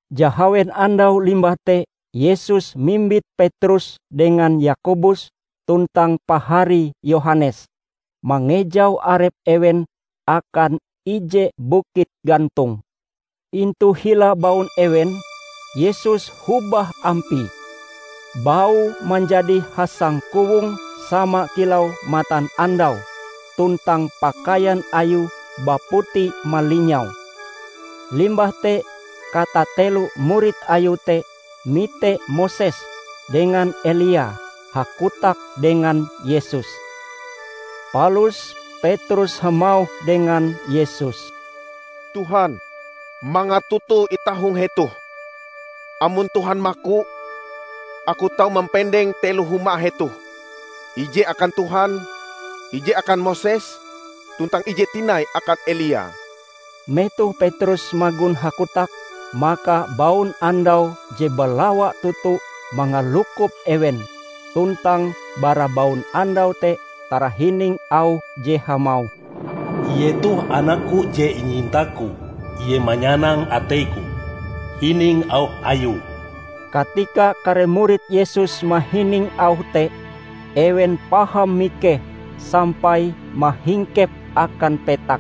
Jahawen andau limbah te Yesus mimbit Petrus dengan Yakobus tuntang paharie Yohanes, mangejau arep ewen akan ije bukit gantong. Intu hila baun ewen, Yesus hobah ampie; Baue manjadi hasangkowong sama kilau matanandau tuntang pakaian Ayue baputi malinyau. Limbah te katatelo murid Ayue te mite Moses dengan Elia hakotak dengan Yesus. Palus Petrus hamauh dengan Yesus, "Tuhan mangat toto itah hong hetoh. Amon Tuhan maku, aku tau mampendeng telo huma hetoh: ije akan Tuhan, ije akan Moses, tuntang ije tinai akan Elia." Metoh Petrus magon hakotak, maka baunandau je balawa toto mangalukop ewen tuntang bara baunandau te tarahining auh je hamauh, "Ie toh anak-Ku je inyinta-Ku. Ie manyanang atei-Ku. Hining Auh Ayue!" Katika kare murid Yesus mahining auh te, ewen paham mikeh sampai mahingkep akan petak.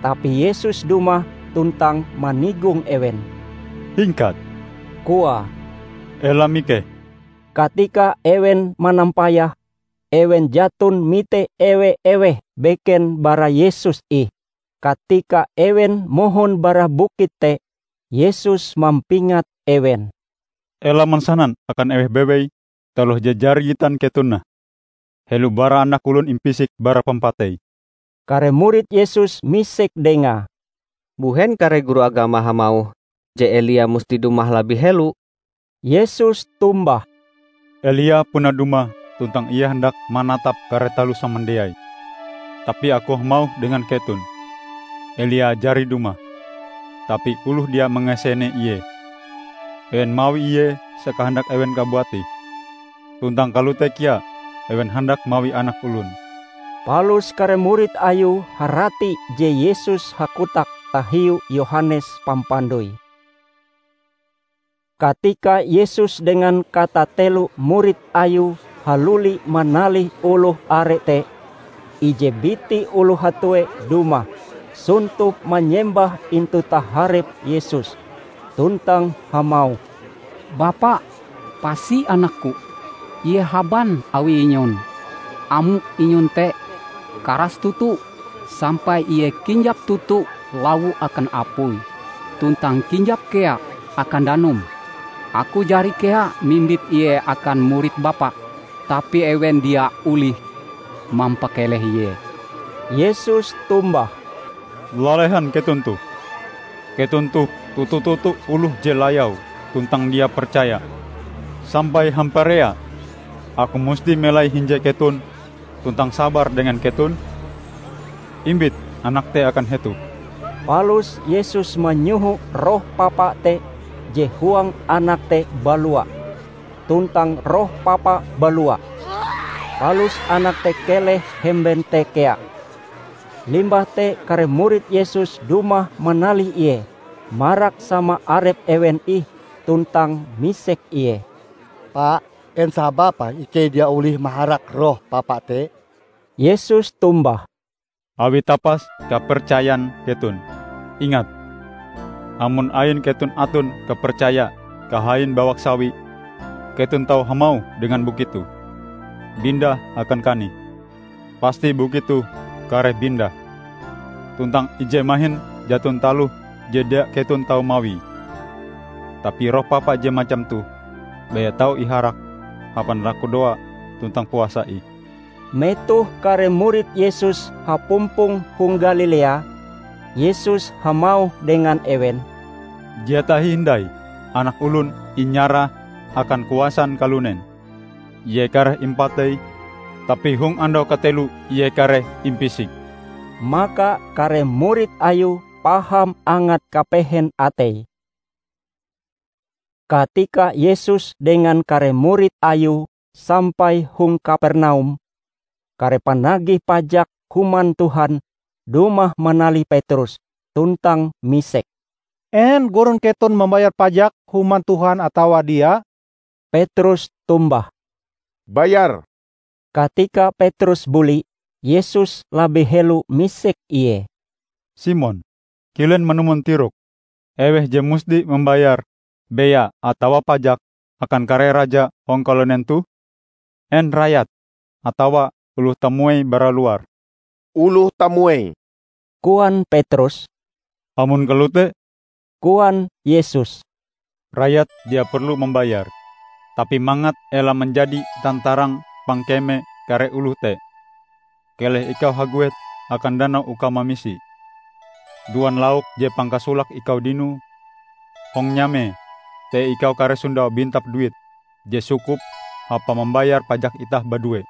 Tapi Yesus dumah tuntang manigong ewen. "Hingkat," koae, "ela mikeh!" Katika ewen manampayah, ewen jaton mite ewe-eweh beken bara Yesus ih. Katika ewen mohon bara bukit te, Yesus mampingat ewen, "Ela mansanan akan eweh bewei taloh je jari gitan keton nah, helo bara Anak Olon impisik bara pampatei." Kare murid Yesus misek Dengae, "Mbuhen kare guru agama hamauh je Elia musti dumah labih helo?" Yesus tombah, "Elia puna dumah tuntang ie handak manatap kare taloh samandiai. Tapi Aku hamauh dengan keton, Elia jari dumah, tapi oloh dia mangasene ie; ewen mawi ie sakahandak ewen kabuat ih. Tuntang kalote kea ewen handak mawi Anak Olon." Palus kare murid Ayue harati je Yesus hakotak tahiu Yohanes Pampandoi. Katika Yesus dengan katatelo murid Ayue haluli manalih oloh are te, ije biti oloh hatue dumah, sontop manyembah intu taharep Yesus, tuntang hamauh, "Bapa, pasi anakku. Ie haban awi inyon. Amok inyon te karas toto sampai ie kinjap toto lawo akan apui tuntang kinjap kea akan danum. Aku jari kea mimbit ie akan murid Bapa, tapi ewen dia olih mampakeleh ie." Yesus tombah, "Lalehan keton toh! Keton toh toto-toto oloh je layau tuntang dia percaya. Sampai hamparea Aku musti melai hinje keton tuntang sabar dengan keton? Imbit anak te akan hetoh!" Palus Yesus manyoho roh papa te je huang anak te balua. Tuntang roh papa balua, palus anak te keleh hemben te kea. Limbah te kare murid Yesus dumah manalih Ie marak sama arep ewen ih tuntang misek Ie, "Pa, en sababe ikei dia olih maharak roh papa te?" Yesus tombah, "Awi tapas kapercayan keton. Ingat! Amon ain keton aton kapercaya kahain bawak sawi, keton tau hamauh dengan bukit toh, 'Bindah akan kanih!' pasti bukit toh kareh bindah. Tuntang ije mahin jaton taloh je dia keton tau mawie! [ Tapi roh papa je macam toh, baya tau iharak hapan lakudoa tuntang puasa ih.]" Metoh kare murid Yesus hapumpong hong Galilea, Yesus hamauh dengan ewen, "Dia tahi hindai, Anak Olon inyarah akan kuasan kalunen. Ie kareh impatei, tapi hong andau kateloe Ie kareh impisik." Maka kare murid Ayue paham angat kapehen ateie. Katika Yesus dengan kare murid Ayue sampai hong Kapernaum, kare panagih pajak Human Tuhan dumah manalih Petrus tuntang misek, "En Gurun keton mambayar pajak Human Tuhan atawa dia?" Petrus tombah, "Bayar!" Katika Petrus buli, Yesus labih helo misek ie, "Simon, kilen manumon tirokm? Eweh je musti mambayar bea atawa pajak akan kare raja hong kalunen toh? En rayat atawa oloh tamuei bara luar?" "Oloh tamuei," koan Petrus. "Amon kalote," koan Yesus, "Rayat dia perlu mambayar. Tapi mangat ela manjadi tantarang pangkeme kare oloh te, keleh ikau haguet akan danau uka mamisi. Duan lauk je pangkasolake ikau dinoe. Hong nyamae te ikau kareh sondau bintap duit je sukup hapa mambayar pajak itah badue.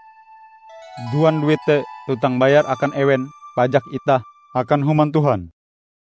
Duan duit te tuntang bayar akan ewen pajak itah akan Human Tuhan."